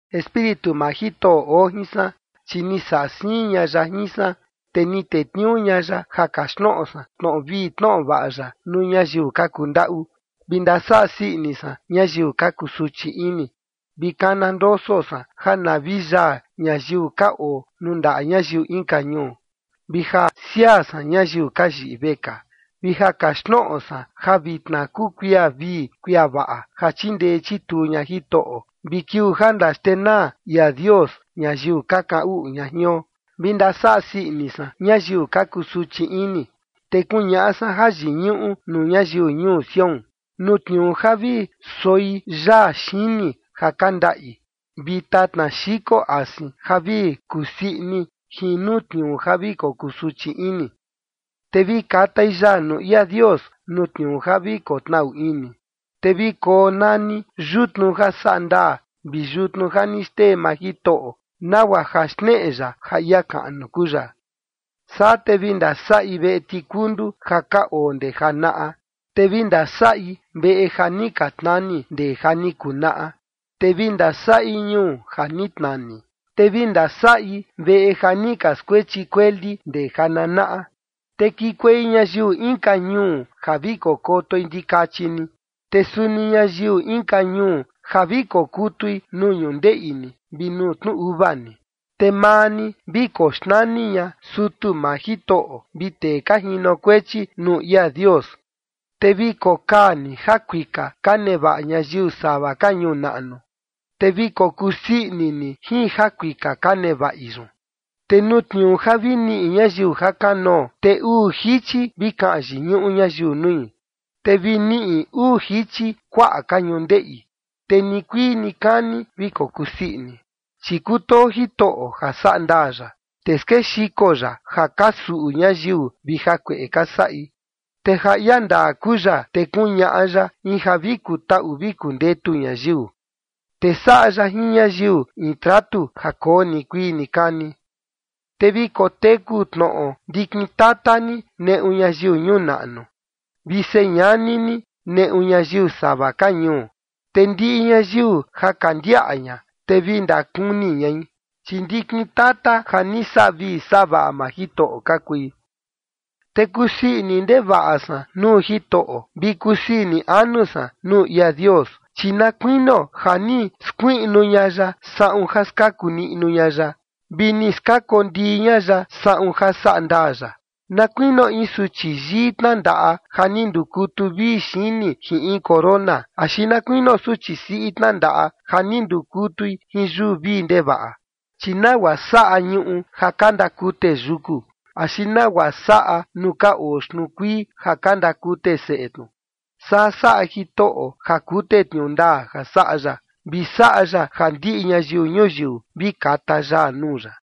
Espíritu maa Jitoꞌo oo jin san, chi ni saꞌa siin ña ya jin san, te ni tetniuu ña ya ja kaxtnoꞌo san tnoꞌo vii tnoꞌo vaꞌa ya nuu ñayiu ka kundaꞌu, vi ndasaꞌa sii ini san ñayiu ka kusuchi ini, vi kana ndoso san ja na vi yaa ñayiu ka oo nuu ndaꞌa ñayiu inka ñuu vi ja siaa san ñayiu ka yiꞌi vekaa. Vi ja kaxtnoꞌo san ja vitna kuu kuia vii kuia vaꞌa ja chindee chituu ña Jitoꞌo, vi kiuu ja ndaxtenaa ia Dios ñayiu ka kaꞌan uꞌu ña jion, vi ja ndasaꞌa sii ini san ñayiu ka kusuchi ini. Te kuñaꞌa san jayiñuꞌu nuu ñayiu ñuu Sión nuu tniuu ja vi soi yaa xini ja ka ndaꞌi, vi tatna xiko asin ja vi kusii ini jin nuu tniuu ja vi kokusuchi ini, te vi katai yaa nuu ia Dios nuu tniuu ja vi kotnaꞌu ini, te vi konani “yutnu ja saꞌa ndaa” vi “yutnu ja ni xtee maa Jitoꞌo” nagua ja xneꞌe ya ja ia kaꞌnu kuu ya. Saa te vi ndasaꞌi veꞌe tikundu ja ka oo ndee janaꞌa, te vi ndasaꞌi veꞌe ja ni ka tnani ndee ja ni kunaꞌa. Te vi ndasaꞌi ñuu ja ni tnani, te vi ndasaꞌi veꞌe ja ni ka skuechi kueli ndee jananaꞌa. Te kikuei ñayiu inka ñuu ja vi kokotoi ndikachi ni, te suni ñayiu inka ñuu ja vi kokutui nuu ñundeꞌi ni, vi nuu tnu uva ni. Te maa ni vi koxnani ña “sutu maa Jitoꞌo” vi “tee ka jinokuechi nuu ia Dios”, te vi kokaa ni jakuika ka nevaꞌa ñayiu sava ka ñuu naꞌnu, te vi kokusii ini ni jin jakuika ka nevaꞌi yun. Te nuu tniuu ja vi niꞌi ñayiu jakanoo, te uu jichi vi kaꞌan yiñuꞌu ñayiu nui, te vi niꞌi uu jichi kuaꞌa ka ñundeꞌi, te nikuii nikani vi kokuu sii ini. Chi kutoo Jitoꞌo ja saꞌa ndaa ya, te skexiko ya ja ka suꞌu ñayiu vi jakueꞌe ka saꞌi. Te ja ia ndaa kuu ya, te kuñaꞌa ya in ja vi kutaꞌu vi kundetu ñayiu, te saꞌa ya jin ñayiu in tratu ja koo nikuii nikani. Te vi koteku tnoꞌo ndikin tata ni neꞌu ñayiu ñuu naꞌnu, vi señani ni neꞌu ñayiu sava ka ñuu, te ndiꞌi ñayiu ja ka ndiaꞌa ña, te vi ndakuni ñai, chi ndikin tata ja ni saꞌa vii saꞌa vaꞌa maa Jitoꞌo ka kui. Te kusii ini ndevaꞌa san nuu Jitoꞌo, vi kusii ini anu san nuu ia Dios, chi na kuinio ja ni skuiꞌnu ña ya saꞌun ja skaku niꞌnu ña ya, vi ni skakondii ña ya saꞌun ja saꞌa ndaa ya, na kuinio in suchi yii tnandaꞌa ja ni ndukutu vii xini jin in corona, axi na kuinio suchi siꞌi tnandaꞌa ja ni ndukutui jin yuu vii ndevaꞌa. Chi nagua saꞌa ñuꞌu ja ka ndakute yuku, axi nagua saꞌa nuu ka oo xtnuu kuii ja ka ndakute seꞌe tnu, saa saꞌa Jitoꞌo ja kute tniuu ndaa ja saꞌa ya, vi saꞌa ya ja ndiꞌi ñayiu ñuyiu vi kata yaa nuu ya.